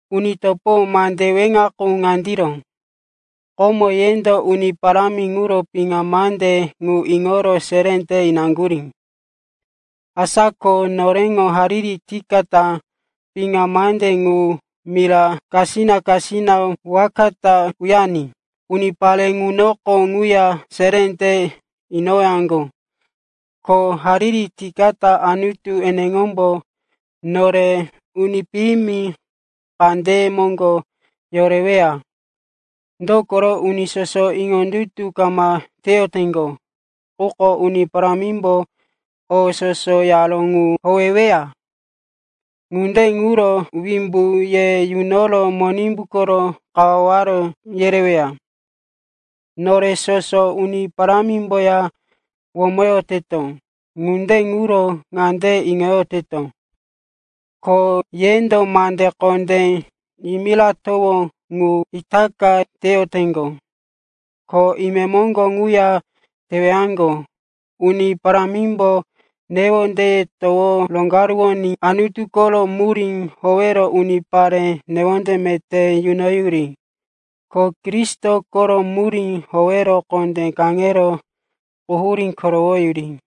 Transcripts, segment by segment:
Uni topo, mandene weŋa ŋuko ŋandiro. Komo yendo Uni Parámi ŋuro piŋa mande ŋu iŋoro seré te inaŋgurí. Asa ko noreŋo hariri tikata piŋa mande ŋu mira kasina-kasina waka ta uyariní unipare ŋunoko ŋuya seré te inowaŋgo. Ko hariri tikata Anutu eneŋombo nore uni piyimi kandeye moŋgo yoreweya. Dokoro uni soso iŋondutu kama teyoteŋgo. Quko Uni Parámimbo o soso yaró ŋu howeweya. Ŋunde ŋuro wimbu ye yunoro Monimbu koro kawaware yereweya. Nore soso Uni Parámimboya womoyoteto. Ŋunde ŋuro ŋande iŋoyoteto, ko yendo mande kondé yimiratowó ŋu itaka teyoteŋgo, ko imemoŋgo ŋuya tewaŋgo. Uni Parámimbo newondeye towo roneneŋoní Anutu koro murí howero unipare newonde meté yunoyuri, ko Kristo koro murí howero kondé kaŋero quhurí korowoyuri.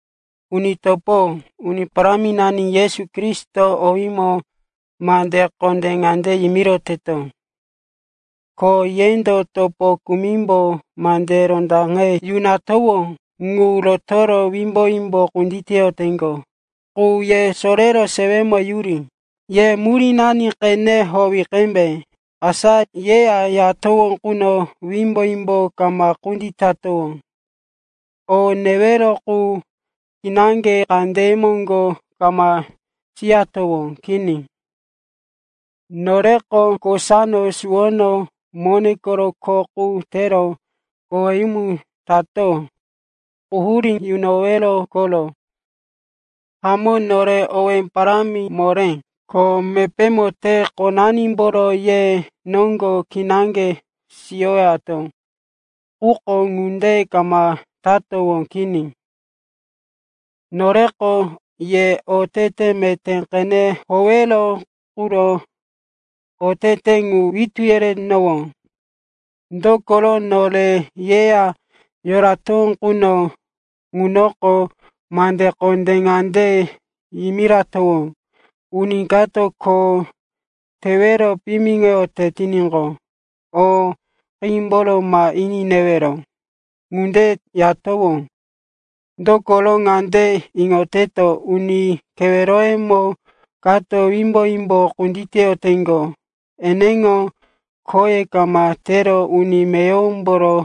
Uni topo, Uni Paráminani Yesu Kristo owímo mande kondé ŋande yimiroteto, ko yendo topo kumimbo mande rondaqe yunatowó ŋu rotoro wimbo-wimbo kunditeyoteŋgo qu ye sorero sewemo yuri. Ye murínani qene howi qembe. Asa yeya yoratowó quno wimbo-wimbo kama kunditatowó, o newero qu kinaŋge kandeye moŋgo kama siyatowó. Kini. Noreko kosano suwono mone koro kho qu tero koweyumu tato. Quhurí yunowero koro. Hamó nore owé parámi moré, ko mepémo te-qonanimboro ye noŋgo kinaŋge siyowato. Quko ŋunde kama tatowó. Kini, noreko ye otete meté qene howewero quro otete ŋu witú yeretowó. Dokoro nore yeya yoratowó quno ŋunoko, mande kondé ŋande yimiratowó, uni kato kho tewero piyimiŋoyote tiníqo, o qímboro ma ini newero. Ŋunde yatowó, dokoro ŋande iŋoteto, uni keweroyemo kato wimbo-wimbo kunditeyoteŋgo. Eneŋo khoye kama tero uni meyowomboro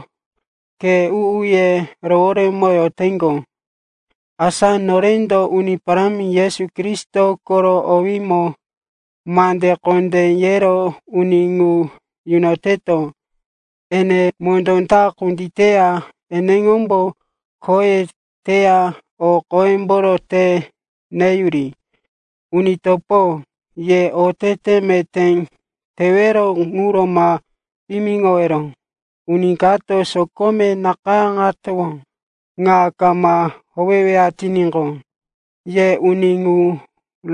khe u-uye roworemoyoteŋgo. Asa norendo Uni Parámi Yesu Kristo koro owímo mande kondé yero uni ŋu yunoteto, ene mondó ta kunditeya, eneŋombo khoye teya o qoyemboro te neyuri. Uni topo, ye otete meté teyowero ŋuro ma piyimiŋowero. Uni kato sokome nakayáŋatowó ŋa kama howeyoweya tiníqo, ye uni ŋu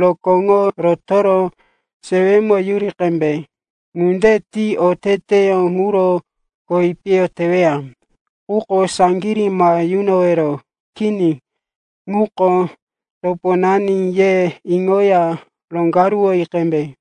rokóŋo rotoro sewemo yuri qembe. Ŋunde ti oteteyó ŋuro kowi piyo teweya. Quko saŋgirí ma yunowero. Kini, ŋuko toponani, ye iŋoya roŋgaruwoyi qembe.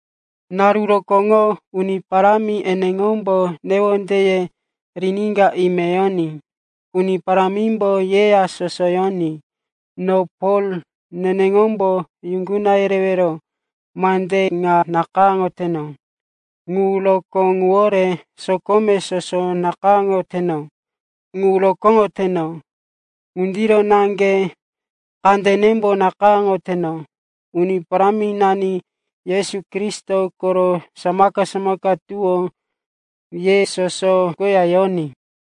Naru rokóŋo Uni Parámi eneŋombo newondeye riníka ime yoní. Uni Parámimbo yeya soso yoní. No Pol neneŋombo yuŋguna yerewero mande ŋa nakayáŋoteno. Ŋu rokó ŋuwore sokome soso nakayáŋoyoteno ŋu rokóŋoteno. Ŋundiro naŋge kandenembo nakayáŋoteno. Uni Paráminani Yesu Kristo koro samaka-samaka tuwó ye soso koya yoní.